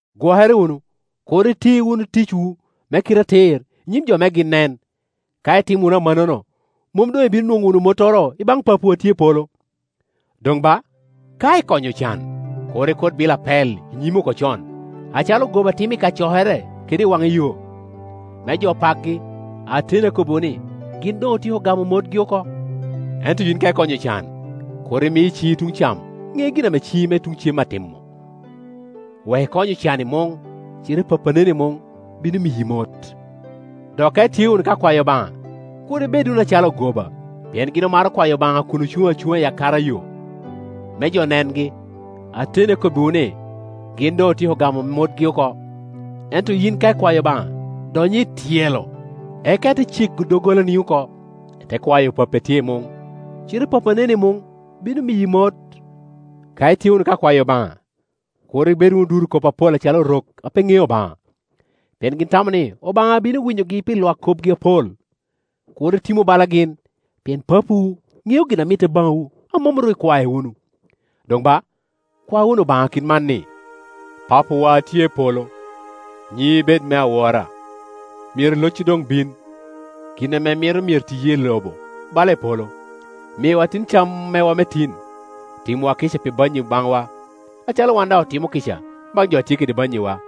“Gwokere wunu, kur iti wunu ticwu me kite atir i nyim jo me gin nen. Ka itimo wunu amannono, mom doŋ ibino nwoŋo wunu mottoro i baŋ Papawu a tye i palo. “Doŋ ba, ka ikonyo ocan, kur ikut bilo apel i nyimi oko con, acalo ogoba timo i kacokere kede i waŋa yo, me jo pakgi. Ateni akobbiwu ni, gin doŋ otyeko gamo motgi oko. Ento yin ka ikonyo ocan, kur imi ciŋi tuŋ cam ŋe gin a ciŋi tuŋ cem atimo, wek ikony ocan i muŋ; cite Pappi a neni i muŋ bino miyi mot. “Dok ka itye wunu ka kwayo Obaŋa, kur ibed wunu acalo ogoba, pien gin omaro kwayo Obaŋa kun ocuŋ acuŋa i kacokere kede i akara yo, me jo nengi. Ateni akobbiwu ni, gin doŋ otyeko gamo motgi oko. Ento yin ka ikwao Obaŋa, dony i tyelo, eka ite cego doggolani oko, ite kwayo Pappi a tye i muŋ; cite Pappi a neni i muŋ bino miyi mot. “Ka itye wunu ka kwayo Obaŋa, kur ibed wunu duro kop acalo Orok a pe ŋeo Obaŋa; pien gin tamo ni Obaŋa bino winyogi pi lwak kopgi apol. Kur itimu bala gin, pien Papawu ŋeo gin a mitte baŋwu a mom ru ikwae wunu. Doŋ ba, kwa wunu Obaŋa kit man, ni, ‘Papawa a tye i polo, nyiŋi bed me awora. Myero locci doŋ bin, gin ame imito myero tiye, i lobo bala i polo. Miwa tin cam mewa me tin; timwa kica pi bannyi i baŋwa, acalo wan daŋ otimo kica baŋ jo a tye kede bannyiwa.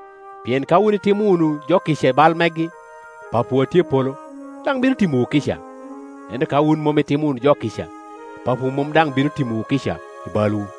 Pien ka wun itimo wunu jo kica i bal megi, Papawu a tye i polo daŋ bino timowu kica; ento ka wun mom itimo wunu jo kica, Papawu mom daŋ bino timowu kica i balwu.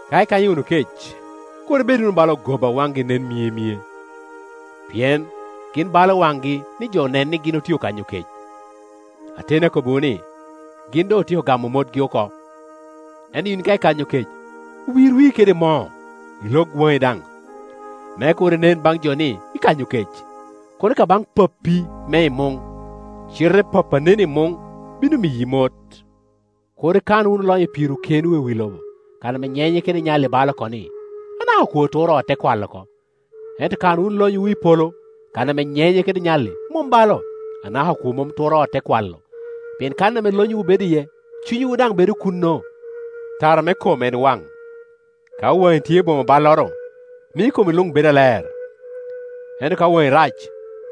“Ka ikanyo wunu kec, kur ibed wunu bala ogoba a waŋgi nen myemye, pien gin balo waŋgi ni jo nen ni gin otye okanyo kec. Ateni akobbiwu ni, gin doŋ otyeko gamo motgi oko. Ento yin ka ikanyo kec, wir wii kede moo ilog waŋi daŋ, me kur inen baŋ jo ni ikanyo kec, kono ka baŋ Pappi me i muŋ; cite Pappi a neni i muŋ bino miyi mot. “Kur ikan wunu lonyo pirwu kenwu i wi lobo, kan ame nyenye kede nyalli balo oko ni, anaka okwo turo ot te kwalo oko. Ento kan wunu lonyowu i polo, kan ame nyenye kede nyalli mom balo, anaka okwo mom turo ot, te kwalo. Pien kan ame lonyowu bedo iye, cunywu daŋ bedo kuno. “Tara me kom en waŋ; ka waŋi tye boŋo balloro, mio komi luŋ bedo aler. Ento ka waŋi rac,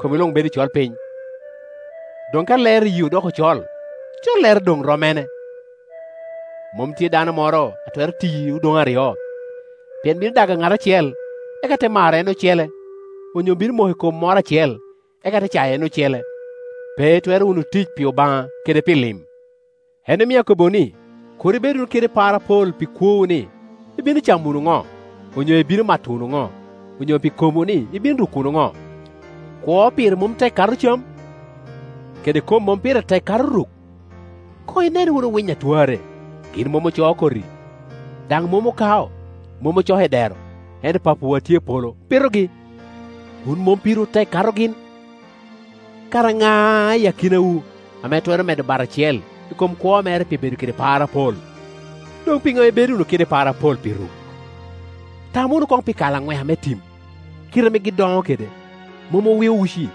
komi luŋ bedo i colpiny. Doŋ ka lero iyii odoko col, collere doŋ rom mene! “Mom tye dano moro a twero tiyi odoŋe aryo; pien bino dago ŋat acel, eka te maro en ocele, onyo bino moko i kom moro acel, eka te cayo en ocele. Pe itwero wunu tic pi Obaŋa kede pi lim. “En omio akobbiwu ni, kur ibed wunu kede par apol pi kwowu, ni ibino camo wunu ŋo, onyo ibino mato wunu ŋo, onyo pi komwu ni ibino ruko wunu ŋo. Kwo pire mom tek kato cam? Kede kom mom pire tek kato ruk? Koŋ inen wunu winy a twarre; gin mom ocoo koti, daŋ mom okao, mom ocoko i dero, ento Papawu a tye i polo pitogi. Wun mom pirwu tek kato gin? Kara ŋa i akinawu ame twero medo bat acel i kom kwo mere pi bedo kede par apol? Doŋ piŋo ibedo wunu kede par apol pi ruk? Tam wunu koŋ pi kalanweka me tim, kite ame gin doŋo kede. Mom owio uci,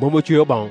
mom acweo boŋo;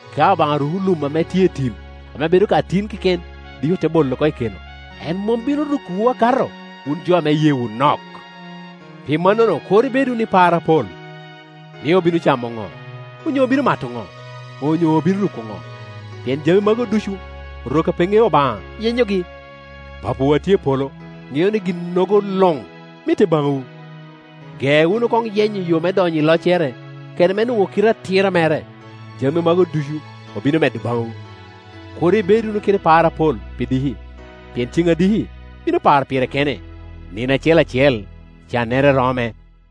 Ka Obaŋa ruko lum ame tye i tim, ame bedo ka tin keken, dik i ote bolo oko i keno, en mom bino rukowu akato, wun jo ame iyeewu nok? Pi mannono kur ibed wunu i par apol, ni, ‘Obino camo ŋo?’ onyo ‘Obino mato ŋo?’ onyo ‘Obino ruko ŋo?’ Pien jami magu ducu Orok a pe ŋeo Obaŋa yenyogi; Papawu a tye i polo ŋeo ni ginnogo luŋ mitte baŋwu. Ge wunu koŋ yenyo yo me donyo i loccere kede me nwoŋo kite atira mere, jami magu ducu obino medo baŋwu. Kur ibed wunu kede par apol pi diki, pien ceŋ a diki bino paro pire kene. Nino acel acel cannere rome.